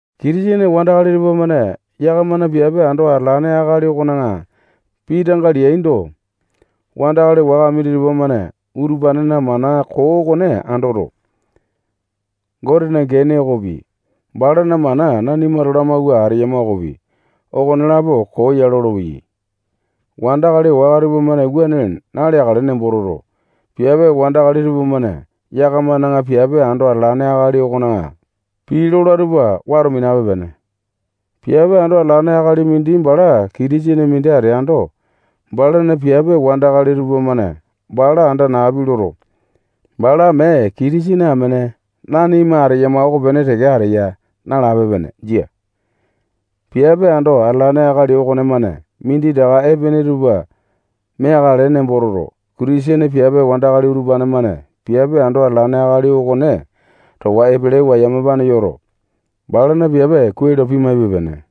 Kitisene wandakali tupamane yakamana piape ando atalane akali okona pii tanga leaindo, wandakali waka minditupa-mane utupanena mana koo okone andoto, Gotena gene okopi, balana mana nanimato lamawua ateyama okopi, okonelapo koo ya lolopeyai. Wandakali waka tupamane wuane naleakale nembo toto, piape wandakali tupamane yakamana piape ando atalane akali okona pii lola tupa wato minape-pene. Piape ando atalane akali mindi bala Kitisene mindi ateando, balana piape wandakali tupamane bala anda napi loto, bala mee Kitisene amene nanima ateyama okopene teke ateya nalape-pene. Jia. Piape ando atalane akali okonemane minditaka epene tupa meakale nembo toto, Kitisene piape wandakali utupane-mane piape ando atalane akali okone towa epelewa yamapane yoto, balana piape kuai lo pimaipe-pene.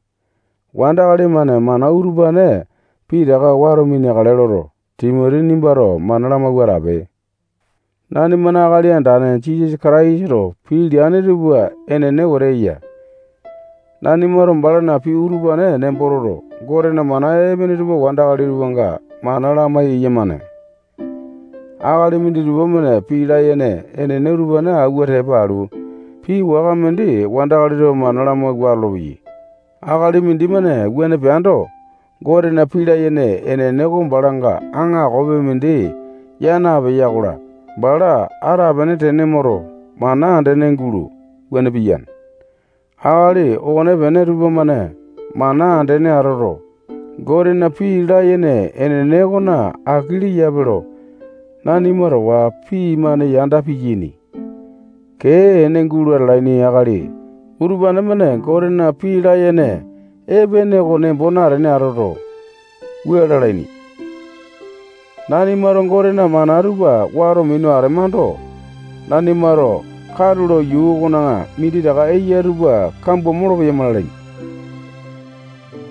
Wandakali-mane mana utupane pitaka wato mineakale loto, Timoti nimbato mana lamawua atape. Nanimana Akali Andane Jisasa Kataisato pii leane tupa enene wetete eya. Nanimato balana pii utupane nembo toto, Gotena mana epene tupa wandakali tupanga mana lamai-yamane. Akali minditupa-mane pii layene enene utupane awua tepa alu, pii waka mindi wandakali tupa mana lamawua atolopeyai. Akali mindimane wuane peando, Gotena pii layene enene oko balanga aakopi mindi yaa napeya-kola, bala atapene tene moto, mana andene gulo, wuane piyane. Akali okonepene tupamane mana andene atoto, Gotena pii layene enene okona aki leyape lo nanima towa pii-mane yanda piyaini. Kee ene gulo atalaini akali utupane-mane Gotena pii layene epene oko nembo natene atoto, wua lalaini: Nanimato Gotena mana tupa wato minu atemando, nanimato katulo yuu okona minditaka eya tupa kambua molopeyama lalaini.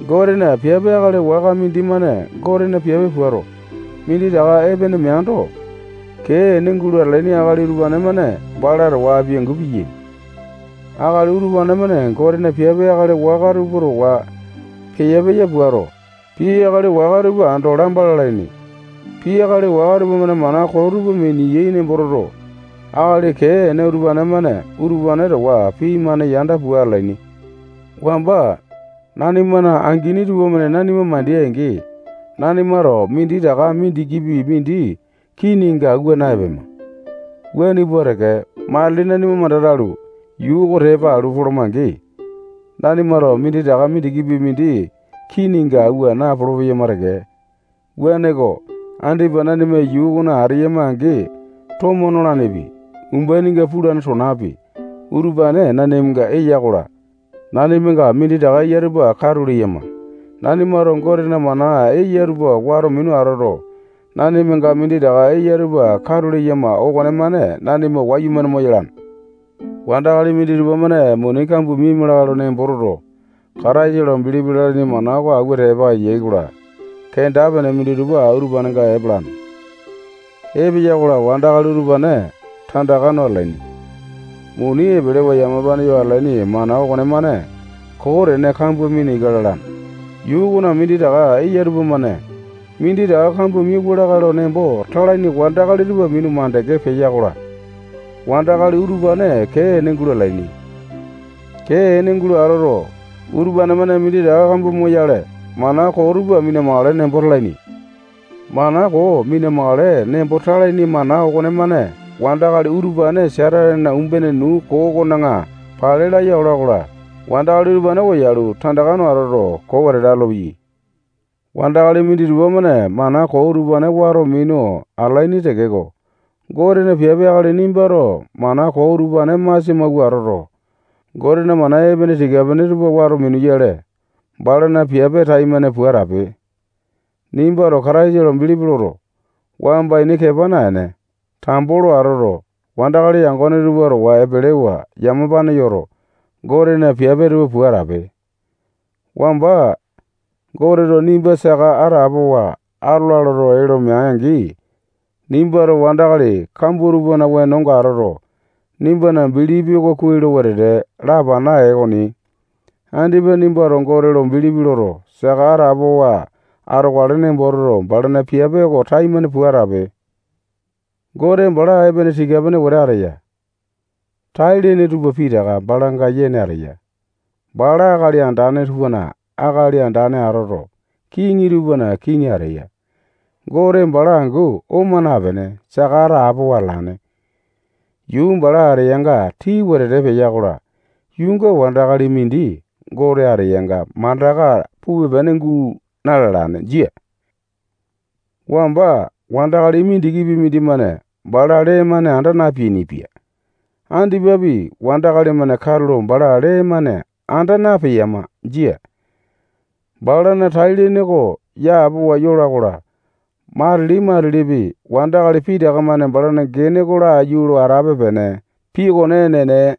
Gotena piape akali waka mindimane Gotena piape puato, minditaka epene meaindo, kee ene gulo atalaini akali utupane-mane bala towa apiangu piyiani. Akali utupane-mane Gotena piape akali waka tupa towa peya-peya puato, pii akali waka tupa ando lamba lalaini. Pii akali waka tupamane mana koo tupa miniyai nembo toto, akali kee ene utupane-mane utupane towa pii-mane yanda pua atalaini. Wamba nanimana angini tupamane nanima mandeai-angi, nanimato minditaka mindikipi mindi kininga awua na-epema. Wuane pua teke, matili nanima manda talu, yuu oko tepa alu poloma-angi, nanimato minditaka mindikipi mindi kininga awua napolo-peyama teke. Wuaneko, andipa nanima yuu okona ateyama-angi, tomo nolanepi, umbaininga pulane tonapi, utupane nanimanga eya-kola, nanimanga minditaka eya tupa katu leyama. Nanimato Gotena mana eya tupa wato minu atoto, nanimanga minditaka eya tupa katu leyama okonemane nanima wayumane moyalane. Wandakali minditupa-mane muni kambua miaima lakae lo nembo toto, Kataisa lo bilipi lalaini mana oko awua tepa eyai-kola, kenda-pene minditupa utupanenga epalane. Epeya-kola, wandakali utupane tandaka no atalaini. Muni epelewa yamapane yo atalaini mana okonemane koo tene kambua mina ika lalane. Yuu okona minditaka eya tupamane minditaka kambua miauwa lakae lo nembo talaini wandakali tupa minu makande peya-kola, wandakali utupane kee ene gulo atalaini. Kee ene gulo atoto, utupane-mane minditaka kambua moyale, mana koo tupa mina-makale nembo talaini. Mana koo mina-makale nembo talaini mana okonemane wandakali utupane Satanena umbene nuu koo okona pale laya ola-kola, wandakali utupane koyalu, tandaka no atoto, koo wetete atolopeyai. Wandakali minditupa-mane mana koo utupane wato minu atalaini tekeko, Gotena piape akali nimbato mana koo utupane masia mawua atoto, Gotena mana epene tika-pene tupa wato minuyale, balana piape taimane pua atape. Nimbato Kataisa lo bilipi loto, wamba ini kepa naene, tambo lo atoto, wandakali yangone tupa towa epelewa yamapane yoto, Gotena piape tupa pua atape. Wamba Goteto nimba saka atapowa atola loto, ee lo mea-angi, nimbato wandakali kambua tupana wenonga atoto, nimbana bilipi oko kuai lo wetete lapana ee okoni. Andipa nimbato Gote lo bilipi loto, saka atapowa atokale nembo toto, balana piape oko taimane pua atape. Gote bala epene tika-pene wetete ateya. Tai-lene tupa pitaka balanga yene ateya. Bala akali andane tupana akali andane atoto, kiŋi tupana kiŋi ateya. Gote bala angu oma napene, saka atapowa atalane. Yuu bala ateyanga tii wetete peya-kola, yuunga wandakali mindi Gote ateyanga mandaka pupe-pene guu na-lalane. Jia. Wamba wandakali mindikipi mindimane bala lee-mane anda napeainipia. Andipapi, wandakali-mane katulo bala lee-mane anda napeyama. Jia. Balana tai-lene oko yapowa yola-kola, matili-matilipi wandakali pitaka-mane balana gene oko laiyu lo atape-pene. Pii okone enene.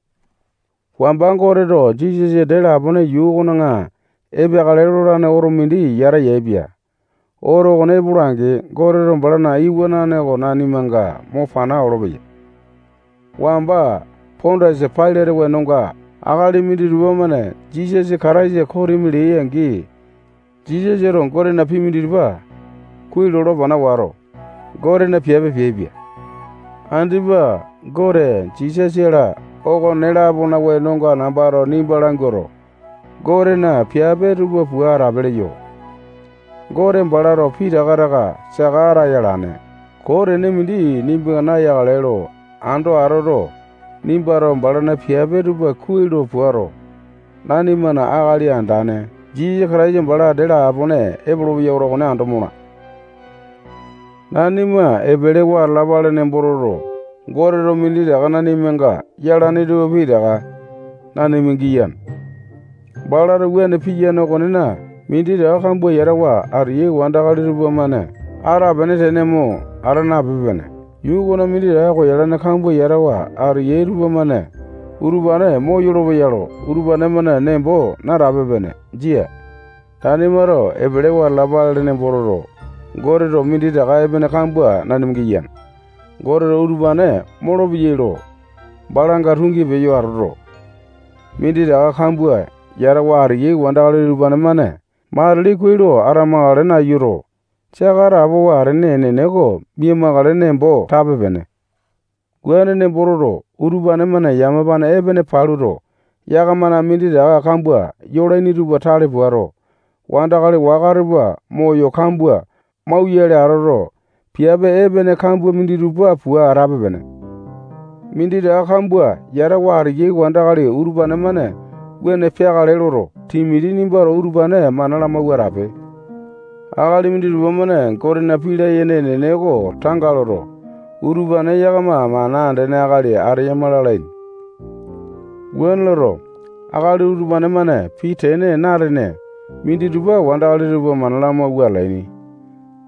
Wamba Goteto Jisasa dee lapone yuu okona epeakale lolane oto mindi yata yaepia. Oto okone epola-angi, Goteto balana iwanane okone nanimanga mo pana olopeya. Wamba Pondiasa Pailate wenonga, akali minditupa-mane Jisasa Kataisa kosimi leai-angi, Jisasato Gotena pii minditupa kuai lo lapana wato, Gotena piape peaipia. Andipa Gote, Jisasa-la, okone-lapona wenonga nambato nimba languato, Gotena piape tupa pua atape leyo. Gote balato pitaka taka saka ataya alane. Koo tene mindi nimbanga nayakale lo ando atoto, nimbato balana piape tupa kuai lo puato, nanimana Akali Andane Jisasa Kataisa bala dee lapone epolopeya oto okone ando mola. Nanima epelewa atalapale nembo toto, Goteto minditaka nanimanga yalane tupa pitaka nanima giyane. Balato wuane piyane okonena, minditaka kambua yatawa ateyai wandakali tupamane atapene tene mo ata napipe-pene. Yuu okona minditaka koyalane kambua yatawa ateyai tupamane utupane moyolo-peya lo utupane-mane nembo natape-pene. Jia. Nanimato epelewa atalapale nembo toto, Goteto minditaka epene kambua nanima giyane. Goteto utupane moyolo-peya lo balanga tungi peyo atoto, minditaka kambua yatawa ateyai wandakali utupane-mane matili kuai lo atamakale nayuto, saka atapowa atene enene oko mia-makale nembo tape-pene. Wuane nembo toto, utupane-mane yamapane epene paluto, yakamana minditaka kambua yolaini tupa tale puato, wandakali waka tupa moyo kambua mauyale atoto, piape epene kambua minditupa pua atape-pene. Minditaka kambua yatawa ateyai wandakali utupane-mane wuane peakale loto, Timoti nimbato utupane mana lamawua atape. Akali minditupa-mane Gotena pii layene enene oko tanga loto, utupane yakama mana andene akali ateyama lalaini, Wuane loto, akali utupane-mane pii tene na-atene minditupa wandakali tupa mana lamawua atalaini.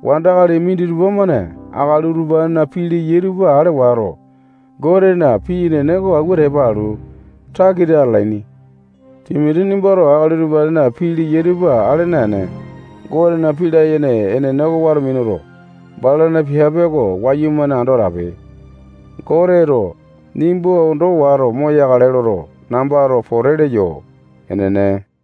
Wandakali minditupa-mane akali utupanena pii leyai tupa ale wato, Gotena pii enene oko awua tepa alu, takita atalaini. Timoti nimbato akali utupanena pii leyai tupa ale naene, Gotena pii layene enene oko wato minuto, balana piape oko wayumane ando atape. Goteto nimba ondo wato moyakale loto, nambato pote leyo. Enene.